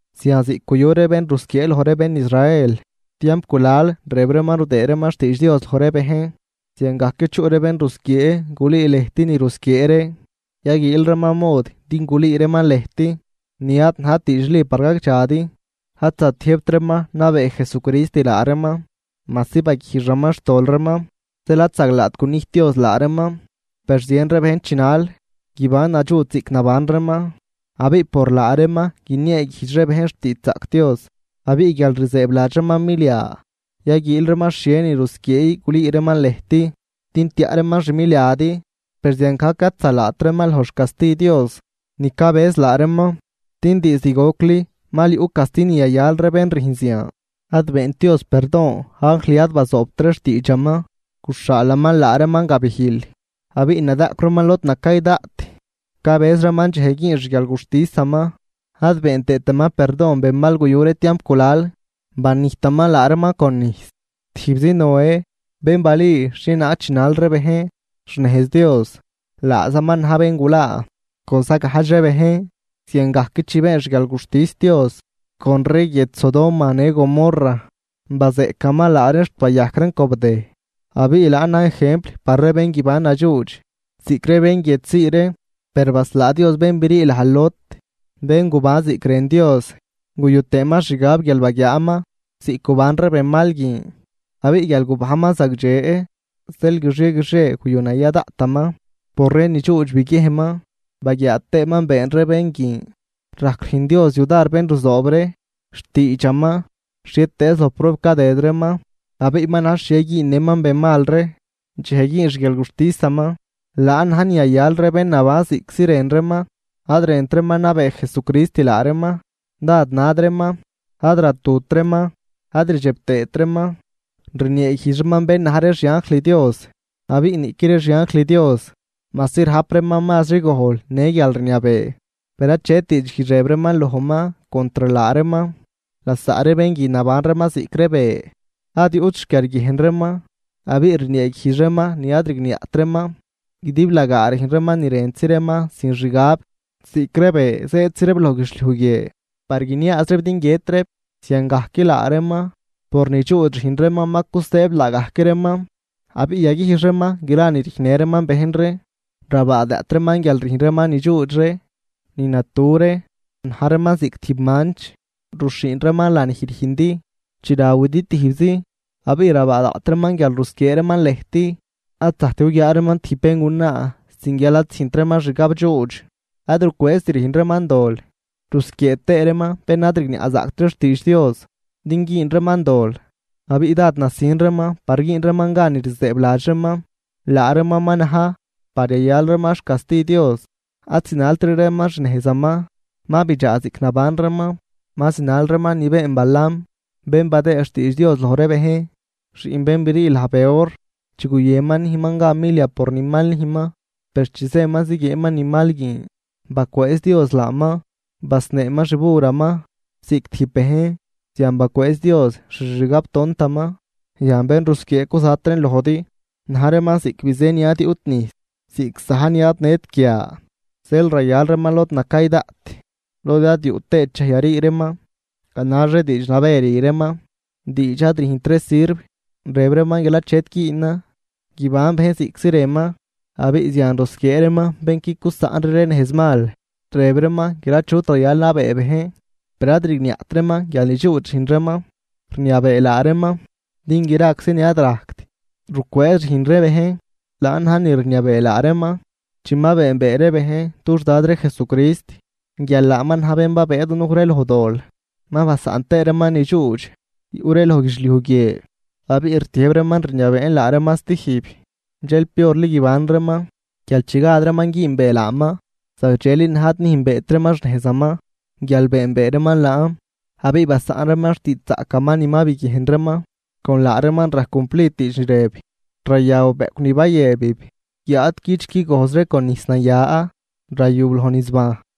Zian ziꞌc guyu ree bén rusquiee loj ree bén Israel tiamp gulal rëb reeman rudëëd reeman xtiidx Dios loj ree bejn, ziangajc chuꞌ ree bén rusquiee gulüü lëjt ni rusquiee ree, yaguiil reeman mod din gulüü reeman lëjt ni ad najt diidxli par gagdxadi. Ad zatiëjbt reeman nabee Jesucrist laa reeman, majsi baguijxaman xtol reeman, zeel ad zaglaat gunijt Dios laa reeman. Per zien ree bejn chinal guiban nadxuudx ziꞌc naban reeman, abiꞌ por laa reeman guinieeguijdx ree bejn xtiidxzaꞌc Dios. Abiꞌ guial rzëëbladx reeman milia, yaguiil reeman xhie ni rusquiee gulüü reeman lëjt din tiaꞌ reeman xmiliadi, per ziangajc ad zalaat reeman loj xcasti Dios ni cabëz laa reeman, din diizd gocli mal yuꞌ casti ni yayal ree bén rüjn zian. Ad beent Dios perdon anjl ad bazoobt ree xtiidxaman, guxhaalaman laa reeman gabijl, abiꞌ nadaꞌcw reeman lod nacay daꞌt, cabëz reeman dxej güün xguialguxtisaman. Ad been tëëtaman perdon benmal guyu ree tiamp gulal, banijtaman laa reeman con nijs. Tijbzi Noé bén balüü xhienaag chinal ree bejn xnejz Dios, laazaman na̱j bén gulaa con zagajdx ree bejn. Ziangajc chi been xguialguxtis Dios con ree guiedx Sodoma në Gomorra, bazeꞌcaman laa reen xt bayajc reen cobdëj, abiꞌ laan na̱j ejempl par ree bén guiban nadxuudx ziꞌc ree bén guiedx zii ree. Per baslaa Dios bén brii laj Lot, bén guban ziꞌc rën Dios guyu tëëman xgab guial baguiaaman ziꞌc guban ree benmal guin. Abiꞌ guial gubajnman zagdxe, zeel guixie guixie guyunaya daꞌtaman por ree nidxuudx biguiejnman baguiaa tëëman been ree bén guin. Rajc rüjn Dios yudar bén ruzoob ree xtiidxaman xhietëëz loj prueb cadëd reeman, abiꞌ ma na̱j xhie güünnëman benmal ree dxej güün xguialguxtisaman. Laan na̱j ni yayal ree bén naban ziꞌctzi rën reeman, ad rënt reeman nabee Jesucrist laa reeman, dád nad reeman, ad ratut reeman, ad rdxeb tëët reeman rnieeguijdx reeman bén na̱j ree xianjl Dios. Abiꞌ niꞌqui ree xianjl Dios, majsi rajp reeman mazri gojl në guialrniabee, per achet diidxguijdx rëb reeman lojman contr laa reeman. Lasaꞌ ree bén guin naban reeman ziꞌc ree be, ad yuꞌt xquiarguiejn reeman abiꞌ rnieeguijdx reeman ni ad rigniaꞌt reeman, guidiblagaa rüjn reeman ni rëntzi reeman sin xgab. Ziꞌc ree be zëëdzi reeb loj guidxliuj guie par guiniaaz reeb din guiët reeb, ziangajc laa reeman por nidxuudx rüjn reeman ma cusëëb laagajc reeman, abiꞌ yaguijx reeman gra ni rüjnnë reeman bejn ree. Rabaa daꞌt reeman guial rüjn reeman ni dxuudx ree, ni natu ree. Na̱j reeman ziꞌc tijb manch, ruxhiin reeman lanij rüjndi chi rawidi tijbzi, abiꞌ rabaa daꞌt reeman guial rusquiee reeman lëjt. Ad zajct guguiaa reeman tijb béngunaa sin guial ad züjnt reeman xgabdxuudx, ad rucwëëzt rüjn reeman dol rusquiee tëë reeman bén ad rigniaꞌzaꞌct ree xtiidx Dios din güün reeman dol, abiꞌ dád nasin reeman par güün reeman gan ni rzëëbladx reeman, laa reeman ma na̱j par yayal reeman xcasti Dios. Ad zinaltri reeman xnejzaman, ma bidxaa ziꞌc naban reeman, ma zinal reeman ni been Balaam bén badëëd xtiidx Dios loj ree bejn, xiꞌn bén brii laj Beor, chi guyënman nüjnman gan milia por ni mal nüjnman. Per chi zëman ziguieenman ni mal guin, bacwëëz Dios laaman, basneeman xburaman ziꞌc tijb bejn, zian bacwëëz Dios xixgabtontaman. Yan bén rusquiee cuzat reen lojdi na̱j reeman ziꞌc bizë ni ad yuꞌt nijs, ziꞌc za̱j ni ad nët guia, zeel rayal reeman lod nacay daꞌt lod ad yuꞌ tëët dxej yarii reeman. Ganax ree diidx nabë rü reeman, diidx ad rüjnt ree sirv, rëb reeman guial achet güünan guiban bejn ziꞌctzi rënman, abiꞌ zian rusquiee reeman bén qui cusaꞌnri ree nejzmal. Rëb reeman guial achut rayal nabee bejn, per ad rigniaꞌt reeman guial nidxuudx rüjn reeman rniabee laa reeman, din graczi ni ad rajct rucwëëz rüjn ree bejn, laan na̱j ni rniabee laa reeman. Chi ma beenbee ree bejn dux Dad ree Jesucrist guial laaman na̱j bén babëë dunuj ree loj dol ma basaꞌn tëë reeman nidxuudx yuꞌ ree loj guidxliuj guie, abiꞌ rtiëjb reeman rniabeen laa reeman stijb, dxel piorli guiban reeman guial chi gad reeman güünbee laaman. Zagdxeli na̱j ad nüjnbeet reeman xnejzaman, guial beenbee reeman laan abiꞌ basaꞌn reeman xtiidxzaꞌcaman ni ma biguiejn reeman. Con laa reeman rajc cumplid diidx ni rëb: “Rayaw bëꞌcw ni bayëbib, guiáad cüch qui gojzri con nijs naya rayub loj nizbajn.”